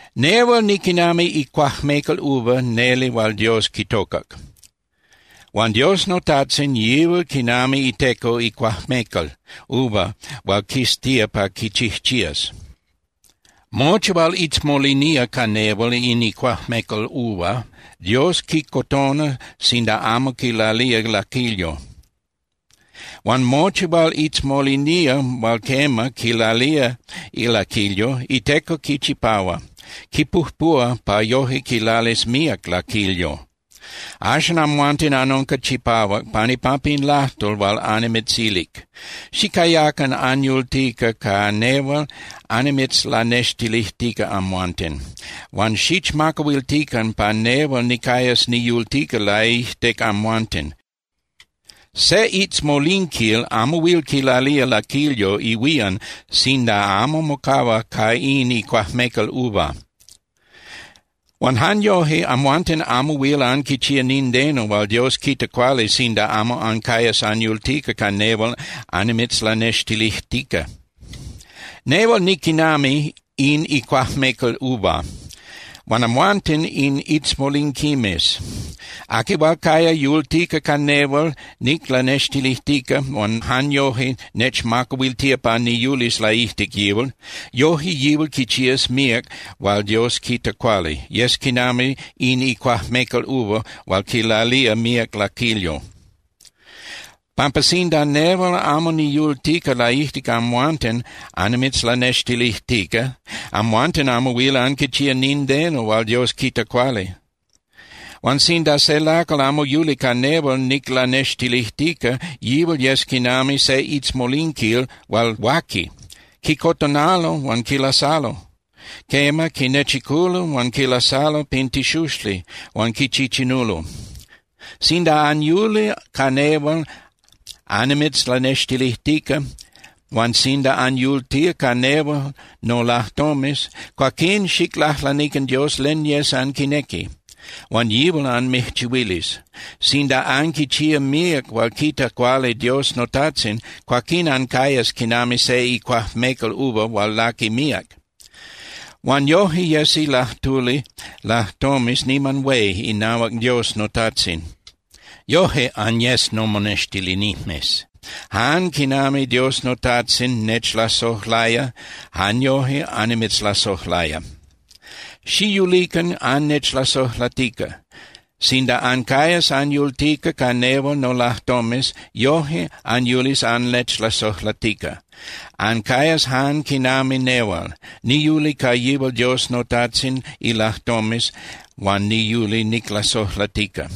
’Nehual niquinami icuajmecal uva neli hual Dios quitocac. Huan Dios noTajtzin, yihual quinami iteco icuajmecal uva hual quiztía pa quichijchías. Mochi hual itzmolinía ca nehual in icuajmecal uva, Dios quicotona sinda amo quilalía laquilyo. Huan mochi hual itzmolinía hual quema quilalía laquilyo, iteco quichipahua, quipujpuhua pa yoje quilalis míac laquilyo. Axan amhuanten anunca chipahuac pan ipampa in lajtol hual annimitzilic. Xicayacan anyultica ca nehual annimitzlanextilijtica amhuanten. Huan xichmacahuiltican pa nehual nicayas niyultica laijtic amhuanten. Se itzmolinquil amo huil quilalía laquilyo ihuían sinda amo mocahua ca in icuajmecal uva. Huan jan yoje, amhuanten amo huil anquichía nindeno hual Dios quita cuali sinda amo ancayas anyultica ca nehual annimitzlanextilijtica. ’Nehual niquinami in icuajmecal uva, huan amhuanten in itzmolinquimes. Aqui hual caya yultica ca nehual niclanextilijtica huan jan yoje nechmacahuiltía pa niyulis laijtic yihual, yoje yihual quichías míac hual Dios quita cuali, yes quinami in icuajmecal uva hual quilalía míac laquilyo. Pampa sinda nehual amo niyultica laijtic amhuanten annimitzlanextilijtica, amhuanten amo huil anquichía nindeno hual Dios quita cuali. Huan sinda se lacal amo yuli ca nehual niclanextilijtica, yihual yes quinami se itzmolinquil hual huaqui. Quicotonalo huan quilasalo. Quema, quinechiculo huan quilasalo pin tixuxli huan quichichinulo. ’Sinda anyuli ca nehual annimitzlanextilijtica huan sinda anyultía ca nel nolajtomes, cuaquín xiclajlanican Dios len yes anquinequi, huan yihual anmijchihuilis. Sinda anquichía míac hual quita cuali Dios noTajtzin, cuaquín ancayas quinami se icuajmecal uva hual laqui míac. Huan yoje yesi lajtuli lajtomes niman hué inahuac Dios noTajtzin. Yoje anyes nomonextilinijmes. Jan quinami Dios noTajtzin nechlasojlaya, jan yoje annimitzlasojlaya. Xiyulican annechlasojlatica. Sinda ancayas anyultica ca nehual nolajtomes, yoje anyulis annechlasojlatica. Ancayas jan quinami nehual. Niyuli ca yihual Dios noTajtzin ilajtomes huan niyuli niclasojlatica.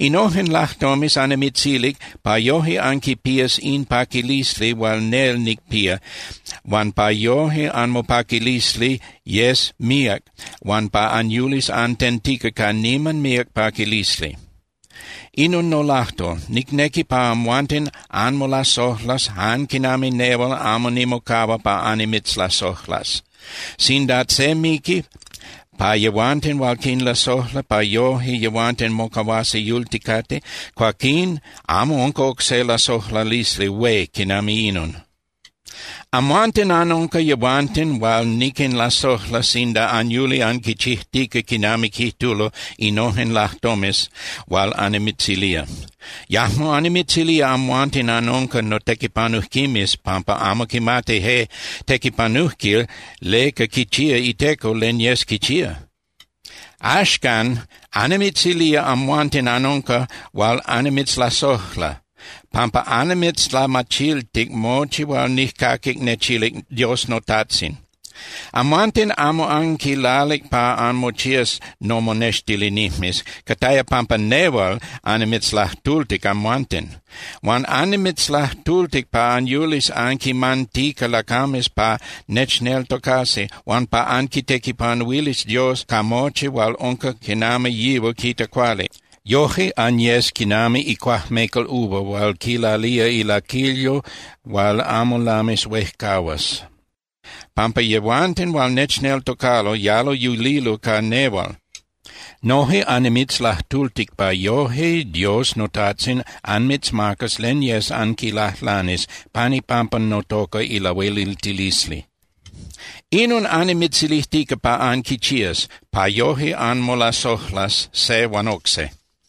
’Innojen lajtomes annimitzilic pa yoje anquipías in paquilisli hual nel nicpía huan pa yoje anmopaquilisli yes míac huan pa anyulis antentica ca niman míac paquilisli. Inon nolajtol: Nicnequi pa amhuanten anmolasojlas jan quinami nehual amo nimocahua pa annimitzlasojlas. Sinda se miqui pa yehuanten hual quinlasojla pa yoje yehuanten mocahuasi yulticate, cuaquín amo unca oc se lasojlalisli hué quinami inon. Amhuanten anunca yehuanten hual niquinlasojla sinda anyuli anquichijtica quinami quijtulo innojen lajtomes hual annimitzilía. Yajmo annimitzilía amhuanten anunca notequipanujquimes, pampa amo quimati je tequipanujquil leca quichía iteco len yes quichía. Axcan, annimitzilía amhuanten anunca hual annimitzlasojla pampa annimitzlamachiltic mochi hual nijcaquic nechilic Dios noTajtzin. Amhuanten amo anquilalic pa anmochías nomonextilinijmes. Cataya pampa nehual annimitzlajtultic amhuanten. Huan annimitzlajtultic pa anyulis anquinmantica lacames pa nechneltocasi huan pa anquitequipanuilis Dios ca mochi hual unca quinami yihual quita cuali. Yoje anyes quinami icuajmecal uva hual quilalía ilaquilyo hual amo lamis huejcahuas, pampa yehuanten hual nechneltocalo yalo yulilo ca nehual. Noje annimitzlajtultic pa yoje Dios noTajtzin anmitzmacas len yes anquilajlanis pan ipampa notoca ilahueliltilisli. Inon annimitzilijtica pa anquichías, pa yoje anmolasojlas se huan oc se.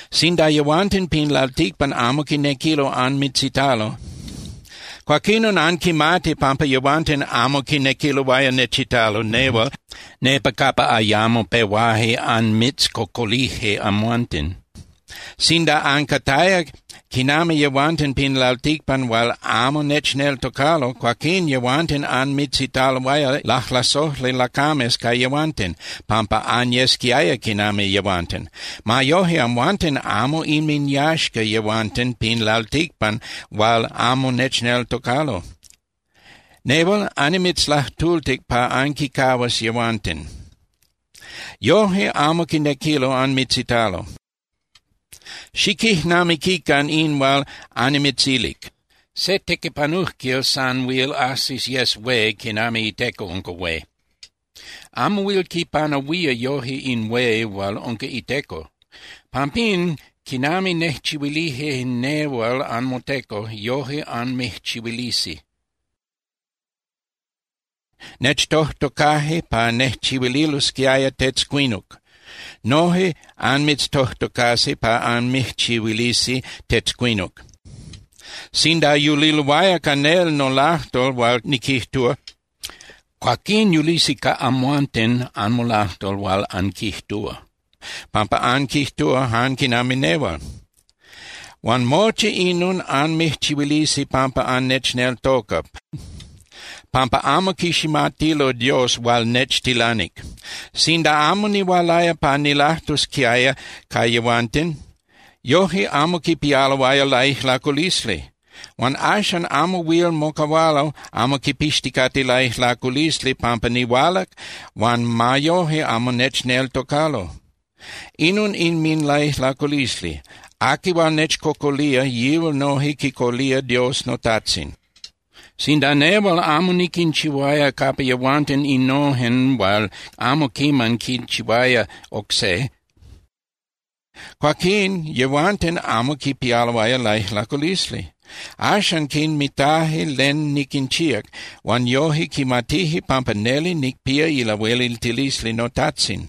’Sinda yehuanten pin lalticpan amo quinequilo anmitzitalo, cuaquinon anquimati pampa yehuanten amo quinequiloaya nechitalo nehual nepa capa ayamo pehuaje anmitzcocolije amhuanten. Sinda ancataya quinami yehuanten pin lalticpan hual amo nechneltocalo, cuaquín yehuanten anmitzitaloaya lajlasojli lacames ca yehuanten, pampa anyesquiaya quinami yehuanten. Ma yoje, amhuanten amo inminyaxca yehuanten pin lalticpan hual amo nechneltocalo. Nehual annimitzlajtultic pa anquincahuas yehuanten. Yoje amo quinequilo anmitzitalo. Xiquijnamiquican in hual annimitzilic: “Se tequipanujquil san huil ajsis yes hué quinami iteco unca hué. Amo huil quipanahuía yoje in hué hual unca iteco.” Pampín, quinami nejchihuilije nehual anmoteco, yoje anmijchihuilisi. Nechtojtocaje pa nejchihuililosquiaya tetzcuinuc. Noje anmitztojtocasi pa anmijchihuilisi tetzcuinuc. Sinda yuliloaya ca nel nolajtol hual niquijtúa, cuaquín yulisi ca amhuanten anmolajtol hual anquijtúa, pampa anquijtúa jan quinami nehual. Huan mochi inon anmijchihuilisi pampa annechneltoca, pampa amo quiximatilo Dios hual nechtilanic. ’Sinda amo nihualaya pa nilajtusquiaya ca yehuanten, yoje amo quipialoaya laijlaculisli. Huan axan amo huil mocahualo amo quipixticate laijlaculisli pampa nihualac huan ma yoje amo nechneltocalo. Inon inminlaijlaculisli. Aqui hual nechcocolía, yihual noje quicocolía Dios noTajtzin. Sinda nehual amo niquinchihuaya capa yehuanten innojen hual amo quiman quinchihuaya oc se, cuaquín yehuanten amo quipialoaya laijlaculisli. Axan quinmitaje len niquinchíac, huan yoje quimatije pampa neli nicpía ilahueliltilisli noTajtzin.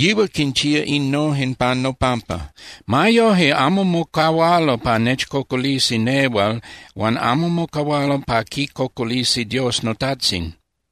Yihual quinchía innojen pan nopampa. Ma yoje amo mocahualo pa nechcocolisi nehual huan amo mocahualo pa quicocolisi Dios noTajtzin.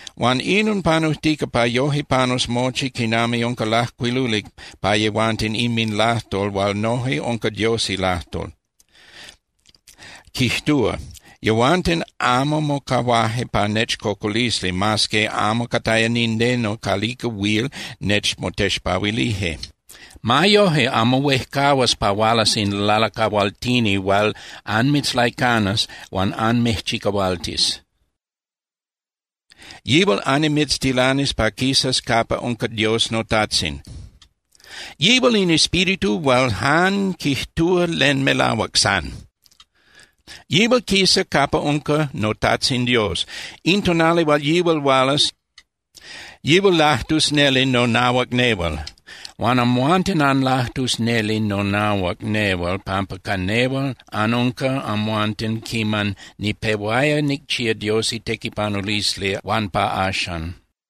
Huan inon panujtica pa yoje panus mochi quinami unca lajcuiluli pa yehuanten inminlajtol hual noje unca Dios ilajtol, quijtúa: “Yehuanten amo mocahuaje pa nechcocolisi, mas que amo cataya nindeno calica huil nechmotexpahuilije.” ’Ma yoje, amo huejcahuas pa hualas in Lalacahualtini hual anmitzlaicanas huan anmijchicahualtis. Yihual annimitztilanis pa quisas capa unca Dios noTajtzin. Yihual in Espíritu hual jan quijtúa len melahuac san. Yihual quisa capa unca noTajtzin Dios. In tonali hual yihual hualas, yihual lajtus neli nonahuac nehual. Huan amhuanten anlajtus neli nonahuac nehual pampa ca nehual anunca amhuanten quiman nipehuaya nicchía Dios itequipanulisli huan pa axan.